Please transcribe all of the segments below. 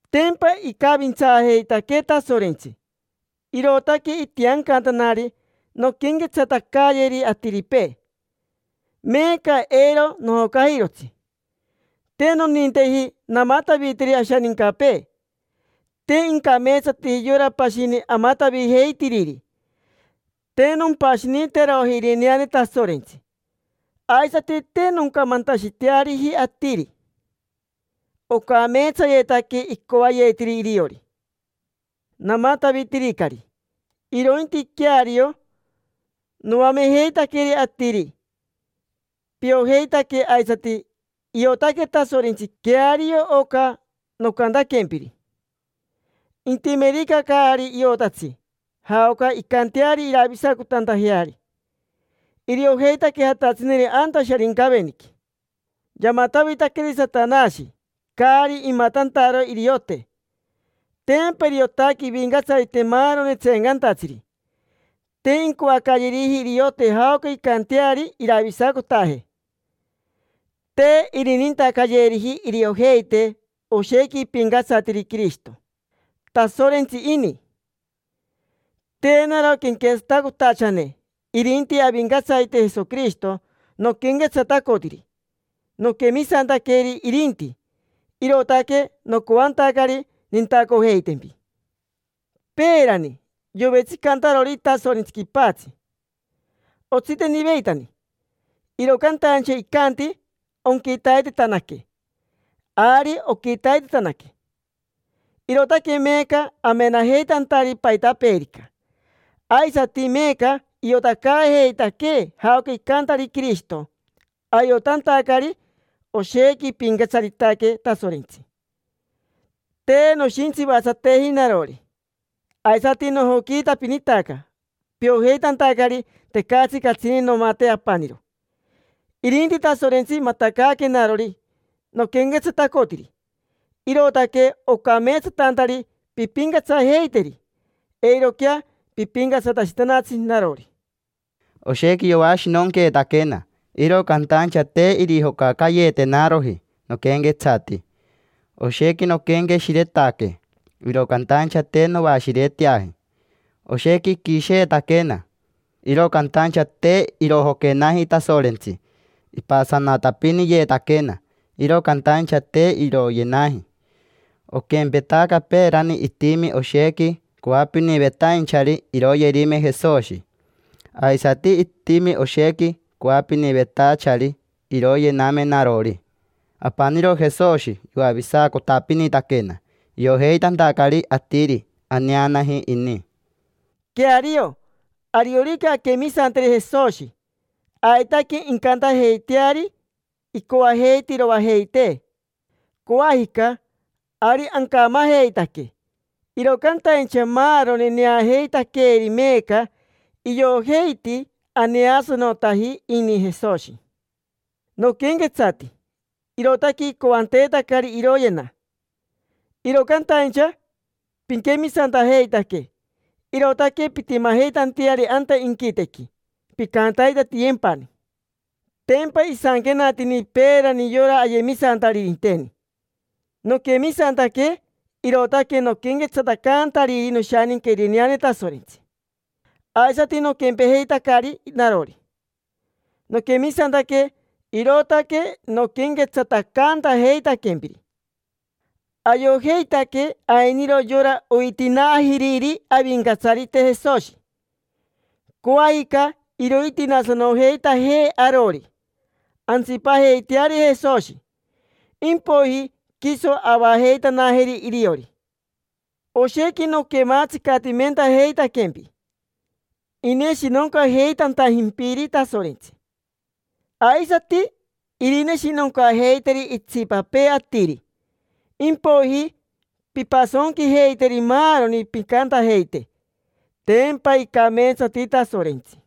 Tempa icavintsaajeitaquee Tasorentsi, irootaque itiancantanari nonquenquetsatacayeri atiripee. Meeca eiro nojocajirotsi. Te noninteji namataviteri ashanincapee: te incameetsateji yora pashini amatavijeitiriri. Te nompashiniteroji irineane Tasorentsi, aisati te noncamantashiteariji atiri ocameetsayetaque icoayetiri iriori: namatavitiricari. Irointi queario noamejeitaqueri atiri. Piojeitaque, aisati iotaque Tasorentsi queario oca nocantaquempiri. Intimerica caari iotatsi jaoca incanteari iravisacotantajeari, iriojeitaque jatatsineri anta Sharincaveniqui. Yamatavitaqueri Satanashi caari imatantaro iriote. Tempa iriotaque ivincatsarite maaroni tseencantatsiri. Te incoacayeriji iriote jaoca incanteari iravisacotaje; te irinintacayeriji iriojeite oshequi ipincatsariti Quirishito, Tasorentsi ini. Te naro quenquetsatacotachane, irinti Avincatsarite Jesoquirishito noquenquetsatacotiri. Noquemisantaqueri irinti, irootaque nocoantacari nintacojeitempi. Peerani, yovetsicantarori Tasorentsi quipatsi, otsiteniveitani, iro cantaincha icanti: “Onquitaitetanaque”. Ari oquitaitetanaque, irootaque meeca amenajeitantari paitapeerica. Aisati meeca iotacaajeitaquee jaoca icantari Quirishito, ayotantacari oshequi ipincatsaritaque Tasorentsi. Te noshintsivatsateji narori, aisati nojoquiitapinitaca piojeitantacari tecatsi catsini nomate apaniro, irinti Tasorentsi matacaaquenarori noquenquetsatacotiri. Irootaque ocameetsatantari pimpincatsajeiteri, eiroquea pipincatsatashitanatsi narori. Oshequi yoashinonqueetaquena, iro cantaincha te irojocacayeetenaroji noquenquetsati; oshequi noquenqueshiretaque, iro cantaincha te noashireteaji. Oshequi iquisheetaquena, iro cantaincha te irojoquenaji Tasorentsi; ipasanatapiniyeetaquena, iro cantaincha te iroyenaji. Oquempetaca peerani itimi oshequi coapinivetainchari iroyerime Jesoshi, aisati itimi oshequi coapinivetachari iroyename narori. Apaniro Jesoshi yoavisacotapinitaquena, iojeitantacari atiri aneanaji ini. Queario, ariorica anquemisanteri Jesoshi, aitaque incantajeiteari, incoajeite iroajeitee. Coajica, ari ancamajeitaque, iro cantaincha maaroni neajeitaqueeri meeca iojeiti aneasanotaji ini Jesoshi. Noquenquetsati, irootaque icoanteetacari iroyena; iro cantaincha piquemisantajeitaque, irootaque pintimajeitanteari anta inquitequi, pincantaitatiyempani. Tempa isanquenatini peerani yora ayemisantaririnteni: “Noquemisantaque, irootaque noquenquetsatacantariri noshaninca irineane Tasorentsi”. Aisati noquempejeitacari narori: noquemisantaque, irootaque noquenquetsatacantajeitaquempiri. Ayojeitaque ainiro yora oitinaajiriri Avincatsarite Jesoshi. Coajica irointinaasanojeitajee arori, antsipajeiteari Jesoshi. Impoiji quiso avajeitanajeri iriori. Oshequi noquematsicatimentajeitaquempi, ineshinoncajeitantajimpiri Tasorentsi: aisati irineshinoncajeiteri itsipapee atiri. Impoiji pimpasonquijeiteri maaroni, pincantajeite: “Tempa icameetsati Tasorentsi”.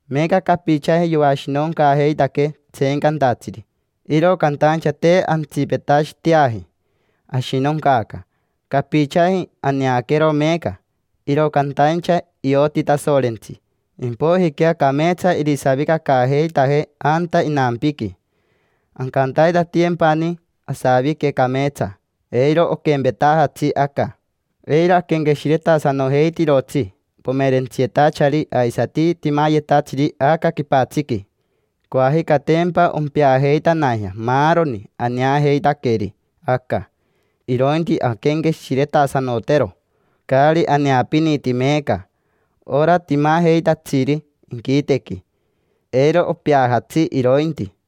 Meeca capichaji yoashinoncaajeitaquee tseencantatsiri, iro cantaincha te antsipetashiteaji ashinoncaaca. Capichaji aneaquero meeca, iro cantaincha ioti Tasorentsi, impoijiquea cameetsa irisavicacaajeitajee anta inampiqui. Ancantaitatiyempani asavique cameetsa, eiro oquempetajatsi aca. Eiro aquenqueshiretasanojeitirotsi pomerentsiyetachari aisati timayetatsiri aca quipatsiqui. Coajica tempa ompeajeitanajea maaroni aneajeitaqueri aca. Irointi anquenqueshiretasanotero caari aneapiniti meeca: ora timajeitatsiri inquitequi. Eiro opeajatsi irointi.